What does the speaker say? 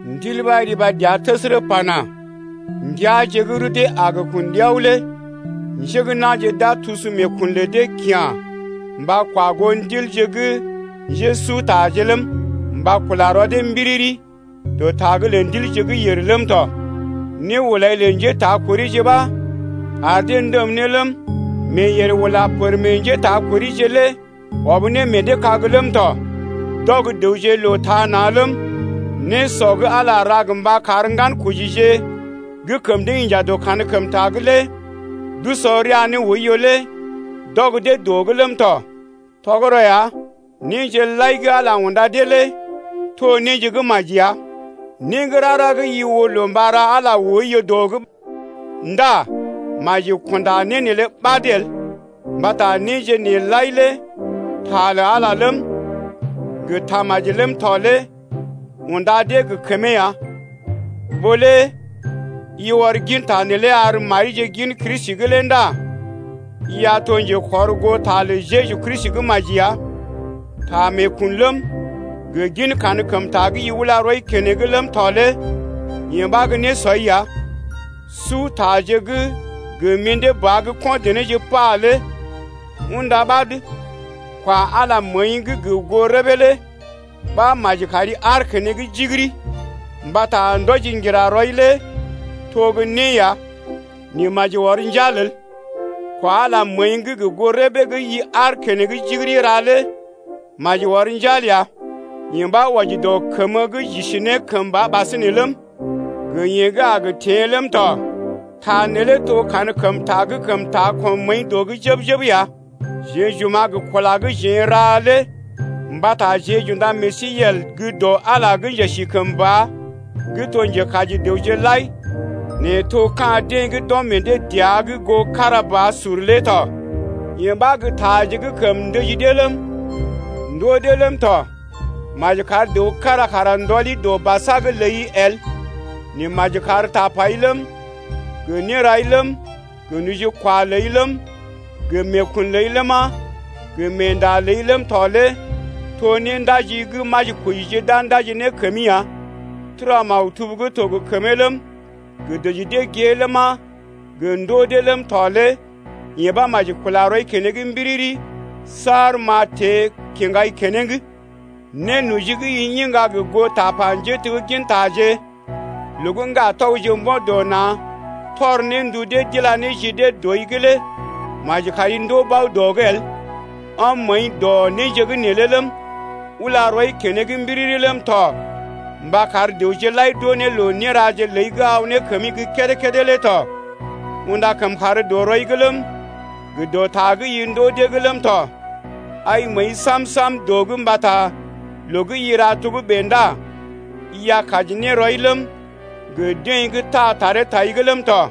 Ndil ɓa riba dəa təsərə pana: Ndəaje gə́ rudee a gə kun ɗiao lé njé gə́ na̰je d’a tusu meekun lə dee kya̰ mba kwa goo ndilje gə́ njésutaje ləm, mba kula rɔ dee mbiriri dɔ ta’g lə ndilje gə́ yèr ləm tɔ. Nehulai lə njétakorije ɓa ar dee ndəm ne ləm, meeyèr ula pər meḛ njétakorije’g lé ɔb ne meḛ dee kág ləm tɔ. D’ɔg dəwje loo taa na̰ ləm, nésɔ gə́ Ala ra gə mba kar ŋgankojije gə́ kəm dee inja dɔ kankəmta’g lé d’usɔ rəa ne oiyo lé d’ɔg dee dɔ’g ləm tɔ. Tɔgərɔ ya, néje lai gə́ Ala unda dee lé to néje gə́ maji ya. Né gə́ rara gə́ i oo loo mba ra Ala oiyo dɔ’g ndá maji kunda né neelé ɓad el, mbata néje nee lai lé ta lə Ala ləm, gə tamaji ləm tɔ lé unda dee gə kəmee ya. Ɓó lé i ɔr ginta neelé ar marije gin Kristi’g lé ndá i a to njekɔrgoota lə Jeju Kristi gə́ maji ya. Ta meekun ləm, gə gin kankəmta gə́ i ula rɔi keneŋ ləm tɔ lé yee ɓa gə́ nésɔi ya. Sutaje gə́ gə mḭdé ba gə́ ko̰ denéje pa lé unda ɓad. Kwa Ala məəi’g gə goo rəbee lé ɓa maji kari aar keneŋ jigiri, mbata ndɔji ŋgira rɔi lé to gə́ né ya, nɛ maji ɔr njal el, kwa Ala məəi’g gə goo rəbee gə́ i aar keneŋ jigiri ra lé maji ɔr njal ya. Yee ɓa wɔji dɔ kəmə gə́ j’isi ne kəmba ɓasinè ləm, gə yeḛ gə́ a gə teḛ ləm tɔ. Ta neelé to kankəmta gə́ kəm taa kɔm məəi dɔ’g jəb-jəb ya. Jeḛ j’oma̰ gə kula gə́ jeḛ n’raje lé mbata jeḛ j’unda meḛ sí yel gə́ dɔ Ala gə́ njesikəmba gə́ to njekaji dəwje lai nɛ to ka̰ deḛ gə́ d’ɔm meḛ dee dəa’g goo kára ba sur lé tɔ. Yee ba gə́ taje gə́ kəm ndəji dee ləm, ndoo dee ləm tɔ. Maji kar dəw kára kara ndɔli dɔ basa’g ləi el, nɛ maji kar tapai ləm, gə nérai ləm, gə nojikwa ləi ləm, gə meekun ləi ləma, gə meenda ləi ləm tɔ lé to néndaji gə́ majikojije d’a ndaji ne kəmi ya. Tura maktub gə́ to gə kəmee ləm, gə dəji dee gée ləma, gə ndoo dee ləm tɔ lé yee ɓa maji kula rɔi keneŋ mbiriri saar m’a teḛ kiŋgai keneŋ. Nénoji gə́ i iŋga gə goo tapa njéteggintaje loo gə́ ŋgatɔgje mbo̰ dɔ na̰ tɔr ne ndu dee d’ila ne ji dee dɔi’g lé maji kari ndoo bao dɔ’g el. Ɔm məəi dɔ néje’g neelé ləm, ula rɔi keneŋ mbiriri ləm tɔ mba kar dəwje lai d’oo ne loo néraje ləi gə́ aw ne kəmi gə́ kédé-kédé lé tɔ. Unda kəmkàr dɔ rɔi’g ləm, gə dɔ ta gə́ i ndoo dee’g ləm tɔ. Ai məəi sam-sam dɔ’g mbata loo gə́ i ra togə́bè ndá i a kaji ne rɔi ləm, gə deḛ gə́ taa taree tai’g ləm tɔ.